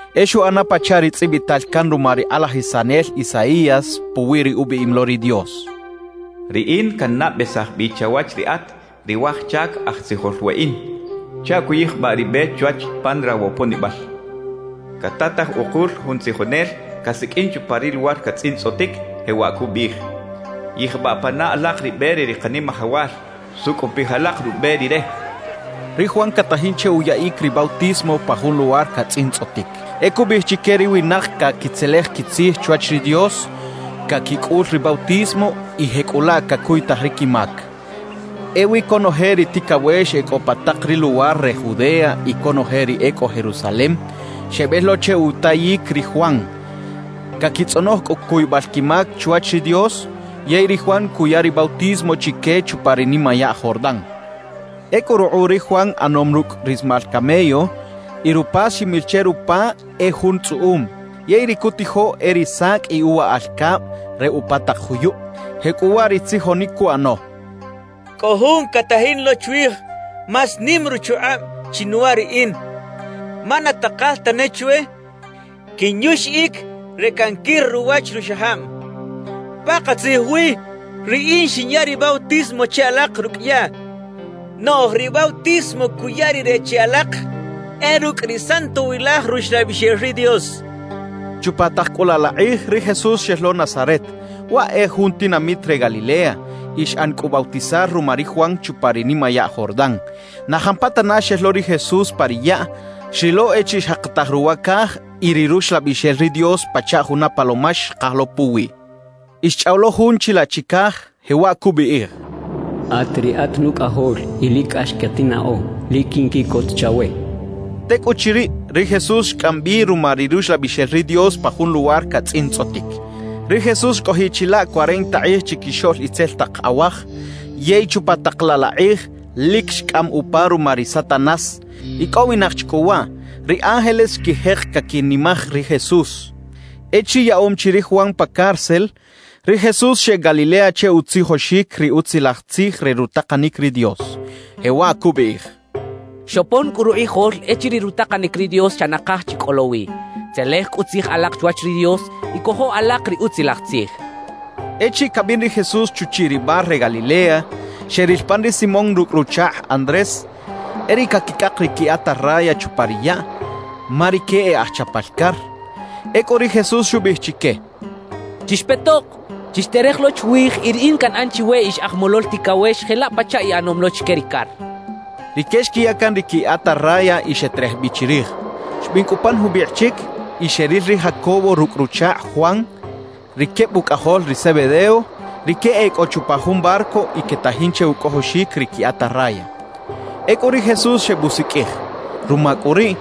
E xuꞌana pachaꞌ ri tzꞌibital can ruma ri kꞌalajisanel Isaías puwi ri ubiꞌim lo ri Dios: Riꞌin cannabesaj bi chawach riꞌat, ri waj chac aj tzijol weꞌin, chaꞌ cuyijbaꞌ ri be chwach pan rawoponibal. Catataj ukul jun tzijonel casiqꞌuin chupa ri luwar catzꞌintzꞌotic, jewaꞌ cubiꞌij: “Yijbaꞌ pana alak ri be re ri Kanimajawal; sucꞌupij alak rube Rire” xchaꞌ. Ri Juan catajin che uyaꞌic ri bautismo pa jun luwar catzꞌintzꞌotic. E cubiꞌij chique ri winak caquitzelej quitzij chwach ri Dios, caquicꞌul ri bautismo, y jecꞌulaꞌ cacuytaj ri quimac. Ewi conoje ri ticawex e cꞌo pa tak ri luwar re Judea y conoje ri e cꞌo Jerusalem, xebel lo che utayic ri Juan. Caquitzꞌonoj cꞌu cuybal quimac chwach ri Dios, yey ri Juan cuya ri bautismo chique chupa ri nimayaꞌ Jordán. Ecꞌu rukꞌuꞌ ri Juan ꞌanom rucꞌ rismal camello, y rupas ximil che rupa e jun tzꞌuꞌum. Yey ri cutijo e ri sacꞌ y uwaꞌal cab re upa tak juyub. Jecꞌuwaꞌ ri tzijonic cuꞌano: «Cꞌo Jun catajin lo chwij más nim ruchukꞌab chinuwa riꞌin, ma na takal tane chwe quinyuxiꞌic re canquir ruwach ruxajab. Pakatzij wi, riꞌin xinya ri bautismo che alak rucꞌ yaꞌ; noꞌj ri bautismo cuya Rire che alak, e rucꞌ ri Santowilaj Ruxlabixel ri Dios» cachaꞌ. Chupa tak cꞌu laꞌ la kꞌij, ri Jesús xel lo Nazaret, (waꞌ e jun tinamit re Galilea), y xꞌan cꞌu bautizar ruma ri Juan chupa ri nimayaꞌ Jordán. Na jampatana xel lo ri Jesús pa ri yaꞌ, xrilo echiriꞌ xjakataj ruwa caj y ri Ruxlabixel ri Dios pachaꞌ juna palomax xkaj lo puwiꞌ. Y xchꞌaw lo Jun chilaꞌ chicaj, jewaꞌ cubiꞌij: «At riꞌat Nucꞌajol y lic cꞌax catinnaꞌo. Lic quinquiꞌcot chawe» xcha che. Tecꞌuchiriꞌ, ri Jesús xcꞌam bi ruma ri Ruxlabixel ri Dios pa jun luwar catzꞌintzꞌotic. Ri Jesús xcꞌojiꞌ chilaꞌ cuarenta kꞌij chiquixoꞌl itzel tak awaj. Yey chupa tak laꞌ la kꞌij, lic xcꞌam upa ruma ri Satanás. Icꞌowinak chi cꞌu waꞌ, ri ángeles xquijek caquinimaj ri Jesús. Echiriꞌ yaꞌom chi ri Juan pa cárcel, ri Jesús xeꞌec Galilea che utzijoxic ri Utzilaj Tzij re rutakanic ri Dios, jewaꞌ cubiꞌij: «Xopon cꞌu rukꞌijol echiriꞌ rutakanic ri Dios xa nakaj chi cꞌo lo wi; tzelej cꞌu tzij alak chwach ri Dios y cojo alak ri Utzilaj Tzij» cachaꞌ. Echiriꞌ cabin ri Jesús chuchiꞌ ri mar re Galilea, xeril pan ri Simón rucꞌ ruchakꞌ Andrés, e riꞌ caquicꞌak ri qui atarraya chupa ri yaꞌ, ma rique e aj chapal car. Ecꞌu ri Jesús xubiꞌij chique: —Chixpetok, chixterej lo chwij y riꞌin canꞌan chiwe ix aj molol ticawex jelaꞌ pachaꞌ iꞌanom lo chique ri car —xchaꞌ. Rique xquiya can ri qui atarraya y xeterej bi chirij. Xbin cꞌu pan jubikꞌ chic y xeril ri Jacobo rucꞌ ruchakꞌ Juan, ri queb ucꞌajol ri Zebedeo. Rique e cꞌo chupa jun barco y quetajin che ucꞌojoxic ri qui atarraya. Ecꞌu ri Jesús xebusiqꞌuij; ruma cꞌu riꞌ,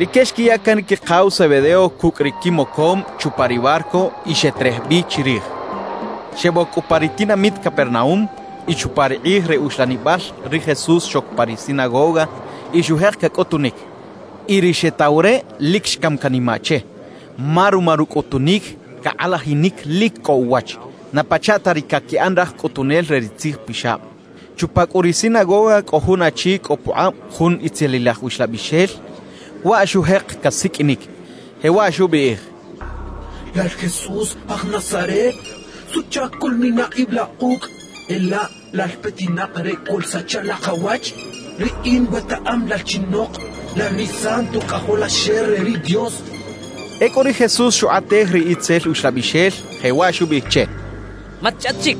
rique xquiya can ri quikaw Zebedeo cucꞌ ri quimocom chupa ri barco y xeterej bi chirij. Xeboc cꞌu pa ri tinamit Capernaúm. Y chupa ri kꞌij re uxlanibal ri Jesús xoc pa ri sinagoga y xujek cacꞌutunic. Y ri xetaw re lic xcam canimaꞌ che, ma ruma rucꞌutunic cakꞌalajinic lic cꞌo uwach, na pachaꞌ ta ri caquiꞌan raj cꞌutunel re ri tzijpixab. Chupa cꞌu ri sinagoga cꞌo jun achi cꞌo pukꞌab jun itzelilaj uxlabixel. Waꞌ xujek casiqꞌuinic, jewaꞌ xubiꞌij: —Lal Jesús, aj Nazaret, ¿suꞌchac coꞌlmina ib la kucꞌ? ¿E laꞌ lal petinak re coꞌlsacha la kawach? Riꞌin wetaꞌam lal chinok, lal ri Santo Cꞌajolaxel re ri Dios —xchaꞌ. Ecꞌu ri Jesús xukꞌatej ri itzel uxlabixel, jewaꞌ xubiꞌij che: —¡Matchꞌaꞌt chic!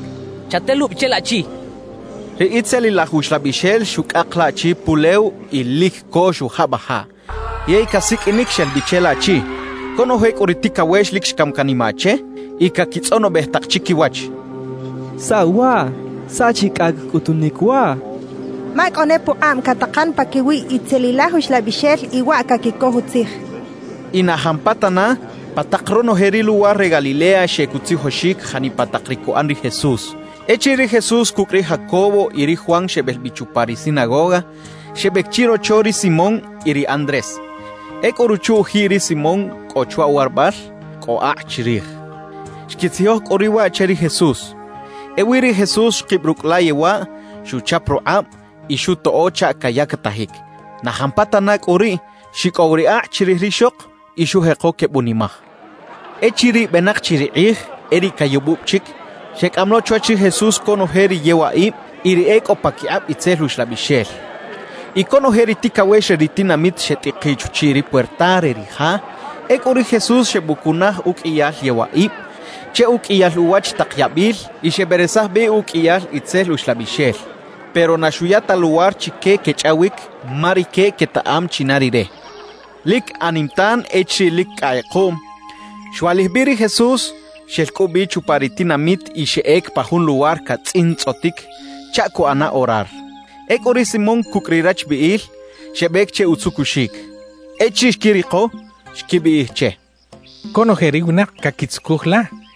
Chatelubi che laꞌchi —xchaꞌ. Ri itzelilaj uxlabixel xucꞌak laꞌchi pulew y lic co xujabajaꞌ; yey casiqꞌuinic xel bi che laꞌchi. Conoje cꞌu ri ticawex lic xcam canimaꞌ che y caquitzꞌonobej tak chiquiwach: «¿Saꞌ waꞌ? ¿Saꞌ chi cꞌacꞌ cꞌutunic waꞌ? Ma cꞌo ne pukꞌab catakan paquiwi itzelilaj uxlabixel y waꞌ caquicoj utzij» quechaꞌ. Y na jampatana, pa tak ronoje ri luwar re Galilea xeꞌec utzijoxic janipa tak ri cuꞌan ri Jesús. Echiriꞌ ri Jesús cucꞌ ri Jacobo y ri Juan xebel bi chupa ri sinagoga, xebec chirocho ri Simón y ri Andrés. Ecꞌu ruchu-ujiꞌ ri Simón cꞌo chwa uwarabal, cꞌo akꞌ chirij. Xquitzijoj cꞌu riꞌ waꞌ che ri Jesús. Ewi ri Jesús xkib rucꞌ la yewaꞌ, xuchap rukꞌab y xutoꞌo chaꞌ cayactajic. Na jampatana cꞌu riꞌ xicꞌow ri akꞌ chirij rixok y xujeko quebunimaj. Echiriꞌ benak chi ri kꞌij e riꞌ cayubub chic, xecꞌam lo chwach ri Jesús conoje ri yewaꞌib y ri e cꞌo paquikꞌab itzel uxlabixel. Y conoje ri ticawex re ri tinamit xetꞌikiꞌ chuchiꞌ ri puerta re ri ja. Ecꞌu ri Jesús xebucunaj uqꞌuiyal yewaꞌib che uqꞌuiyal uwach tak yabil y xeberesaj bi uqꞌuiyal itzel uxlabixel; pero na xuya ta luwar chique quechꞌawic ma rique quetaꞌam china Rire. Lic anim tan echiriꞌ lic cꞌa kꞌekuꞌm, xwaꞌlij bi ri Jesús, xel cꞌu bi chupa ri tinamit y xeꞌec pa jun luwar catzꞌintzꞌotic chaꞌ cuꞌana orar. Ecꞌu ri Simón cucꞌ ri rachbiꞌil xebec che utzucuxic. Echiriꞌ xquiriko, xquibiꞌij che: —Conoje ri winak caquitzucuj la —xechaꞌ.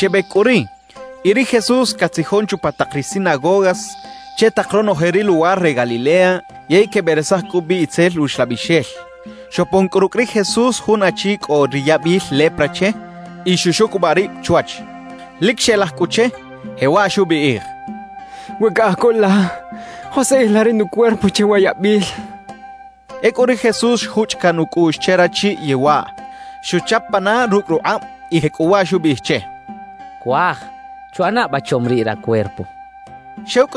Xebec cꞌu riꞌ, y ri Jesús catzijon chupa tak ri sinagogas che tak ronoje ri luwar re Galilea yey queberesaj cꞌu bi itzel uxlabixel. Xopon cꞌu rucꞌ ri Jesús jun achi cꞌo ri yabil lepra che y xuxucubaꞌ rib chwach. Lic xelaj cꞌu che, jewaꞌ xubiꞌij: —We caꞌaj co la, joskꞌij la ri nucuerpo che wa yabil —xchaꞌ. Ecꞌu ri Jesús xjuchꞌ caꞌn ucꞌuꞌx che rachi yewaꞌ. Xuchap pana rucꞌ rukꞌab y jecꞌuwaꞌ xubiꞌij che: —Cuaj, chuꞌana ba chom riꞌ racuerpo —xchaꞌ.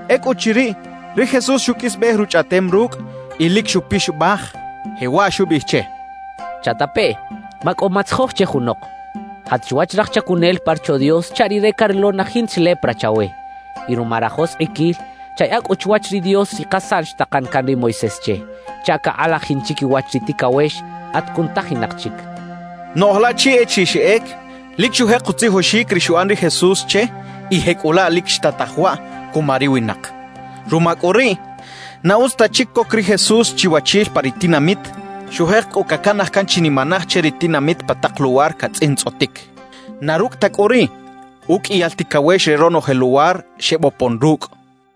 Ecꞌuchiriꞌ, ri Jesús xuqꞌuisbej ruchꞌaꞌtem rucꞌ y lic xupixabaj, jewaꞌ xubiꞌij che: —Chatapeꞌ, macꞌo matzijoj che junok. Jat chwach raj chacunel pa Rocho Dios chaꞌ rire carilo na jinta chi lepra chawe. Y ruma rajoskꞌiquil, chayaꞌa cꞌu chwach ri Dios ri kasaꞌn xtakan can ri Moisés che, chaꞌ cakꞌalajin chiquiwach ri ticawex at cunutajinak chic —xchaꞌ. Noꞌj laꞌchi echiriꞌ xeꞌec, lic xujek utzijoxic ri xuꞌan ri Jesús che y jecꞌulaꞌ lic xtataj waꞌ cuma ri winak. Ruma cꞌu riꞌ, na utz ta chic coc ri Jesús chiwachil pa ri tinamit; xujek cꞌu cacanaj can chinimanaj che ri tinamit pa tak luwar catzꞌintzꞌotic. Na rucꞌ ta cꞌu riꞌ, uqꞌuiyal ticawex re ronoje luwar xebopon rucꞌ.